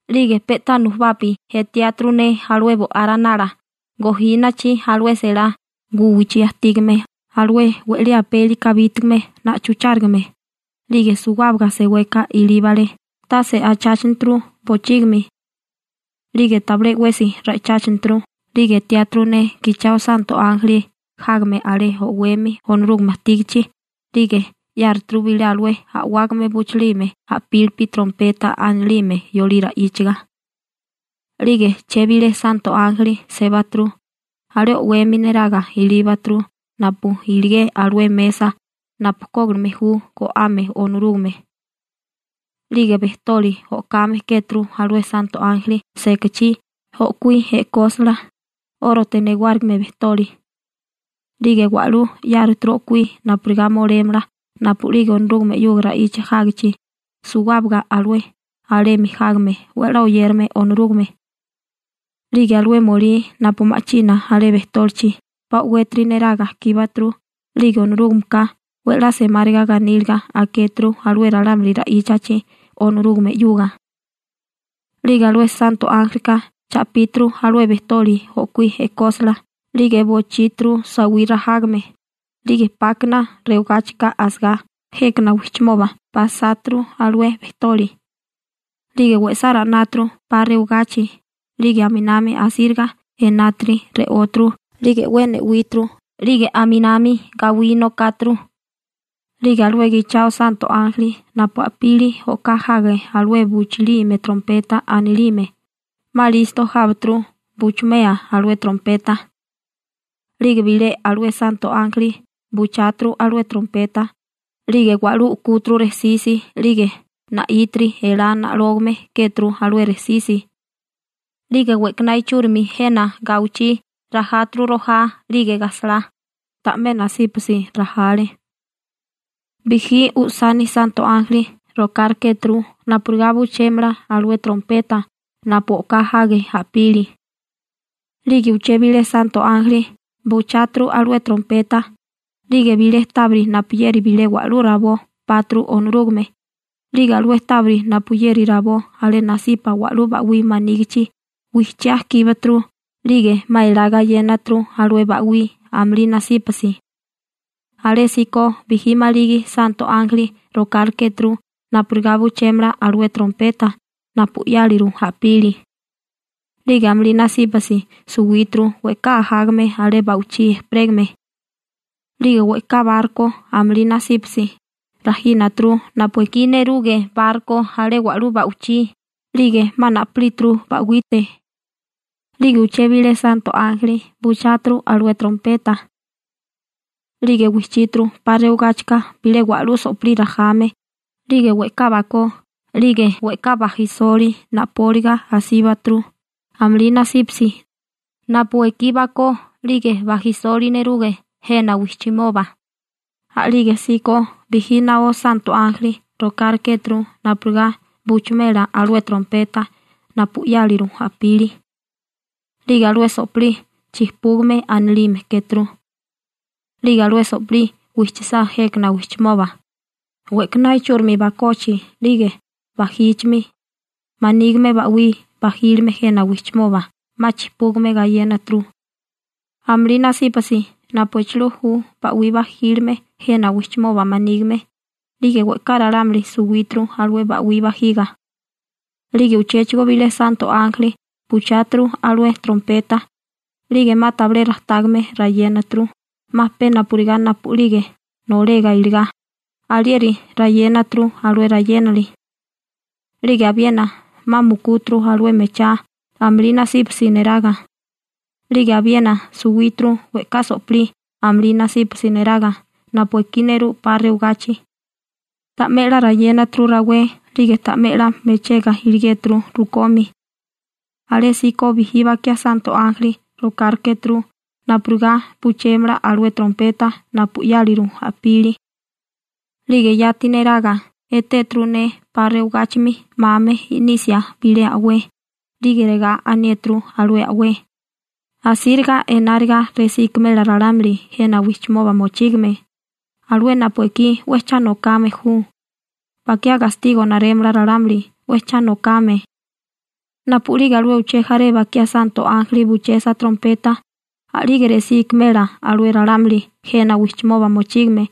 'Lige pe'tá nujubapi etiáturu ne alué Bo'á Ranala gojínachi alué selá guwichí ajtígame alué we'lí apeli kabítigame na'chuchárigame, 'lige suwábaga seweka ilíbale tase acháchaneturu bochígimi 'lige tabilé 'wesi ra'icháchaneturu. 'Lige etéturu ne gichao santo ánjeli jágame alé o'wemi Onorúgame ajtígichi, 'lige 'yáruturu bilé alué a'wágame buchilime a'pílipi, trompeta anilime yolí ra'íchaga. 'Lige uché bilé santo ánjeli sébaturu, alé o'wemi neraga ilíbaturu napu iligé alué mesa napu kógilime ju go'ame Onorúgame. 'Lige bejtoli o'kame kéturu alué santo ánjeli sekachí o'kuí e'kósala, 'órote newárigime bejtoli. 'Lige wa'lú 'yáruturu o'kuí napurigá molémala napu'lige Onorúgame 'yuga ra'icha jágichi suwábaga alué alemi jágame 'we 'la oyérame Onorúgame. 'Lige alué molí napu ma'china alé bejtólichi 'pa o'wétiri neraga kíbaturu 'lige Onorúgameka 'we 'la semáriga ganíliga akéturu alué ralámuli ra'íchachi Onorúgame 'yuga. 'Lige alué santo ánjelika cha'píturu alué bejtoli o'kuí e'kósala 'lige bochíturu sawí rajame, 'lige 'pákana rewagáchika asagá jékana wijchimoba pasáturu alué bejtoli. 'Lige we'sá ra'náturu 'pa rewagachi, 'lige aminami asíriga enátiri re'óturu, 'lige 'we ne'wíturu, 'lige aminami gawí nokáturu. 'Lige alué gichao santo ánjeli napu a'pili o'ká jage alué buchilime trompeta anilime, 'ma listo jábaturu buchumea alué trompeta. 'Lige bilé alué santo ánjeli bucháturu alué trompeta, 'lige wa'lú u'kúturu rejsisi 'lige na'ítiri, elá na'lógame kéturu alué rejsisi. 'Lige we'kaná ichúrimi jena gawichí rajáturu rojá 'lige gajsalá, ta'mé nasípasi rajale. Bijí usani santo ánjeli rokárikéturu napurigá buchémela alué trompeta napu o'ká jage a'pili. 'Lige uché bilé santo ánjeli bucháturu alué trompeta, 'lige bilé tábiri napuyeri bilé wa'lú rabó páturu Onorúgame, 'lige alué tábiri napuyeri rabó alé nasipa wa'lú ba'wí manígichi wijchiá kíbaturu 'lige 'ma elá gayénaturu alué ba'wí amulí nasípasi. Alésíko bijí maligi santo ánjeli rokárikéturu napurigá buchémela alué trompeta napu 'yáliru a'pili. 'Lige amulí nasípasi suwíturu we'ká ajágame alé ba'wichí ejperégame. 'Lige we'ká barko amulí nasípasi rajínaturu napu ekí neruge barko alé wa'lú ba'wichí 'lige 'ma na'pilíturu ba'wite. 'Lige uché bilé santo ánjeli bucháturu alué trompeta 'lige wijchíturu 'pa rewagáchika bilé wa'lú so'pilí rajame 'lige we'ká bakó 'lige we'ká bajisoli na'póliga asíbaturu amulí nasípasi napu ekí bakó 'lige bajisoli neruge jena wijchimoba. A'lígesíko bijí naó santo ánjeli rokárekéturu napurigá buchumela alué trompeta napu 'yáliru a'pili. 'Lige alué so'pilí Chijpúgame anilime kéturu. 'Lige alué so'pilí wijchisá jékana wijchimoba, we'kaná ichúrimi bakochi 'lige bajíchimi manígime ba'wí bajílime jena wijchimoba 'ma chijpúgame gayénaturu, amulí nasípasi napu echilú ju ba'wí bajílime jena wijchimoba manígime, 'lige we'ká ralámuli suwíturu alué ba'wí bajiga. 'Lige uchéchigo bilé santo ánjeli bucháturu alué trompeta, 'lige 'ma tabilé rajtágame rayénaturu, 'ma pe napurigá napu'lige nolega iligá, alieri rayénaturu alué rayénali. 'Lige abiena 'ma mukúturu alué mechá amulí nasípasi neraga. 'Lige abiena suwíturu we'ká so'pilí amulí nasípasi neraga napu ekí nerú 'pa rewagachi. Ta'mé 'la rayénaturu rawé 'lige ta'mé 'la mechega iligéturu rukomi. Alésíko bijí bakiá santo ánjeli rokárikéturu napurigá buchémala alué trompeta napu 'yáliru a'pili. 'Lige yati neraga, etéturu ne 'pa rewagáchimi 'mame i'nisia bilé a'wé, 'lige regá aniéturu alué a'wé: ―¡Asíriga enáriga resí ikimela ralámuli jena wijchimoba mochígame, alué napu ekí 'we cha nokame ju, bakiá gastigo narémala ralámuli 'we cha nokame! ¡Napu'lige alué uché jaré bakiá santo ánjeli buchesa trompeta, a'lige resí ikimela alué ralámuli jena wijchimoba mochígame,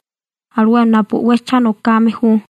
alué napu 'we cha nokame ju!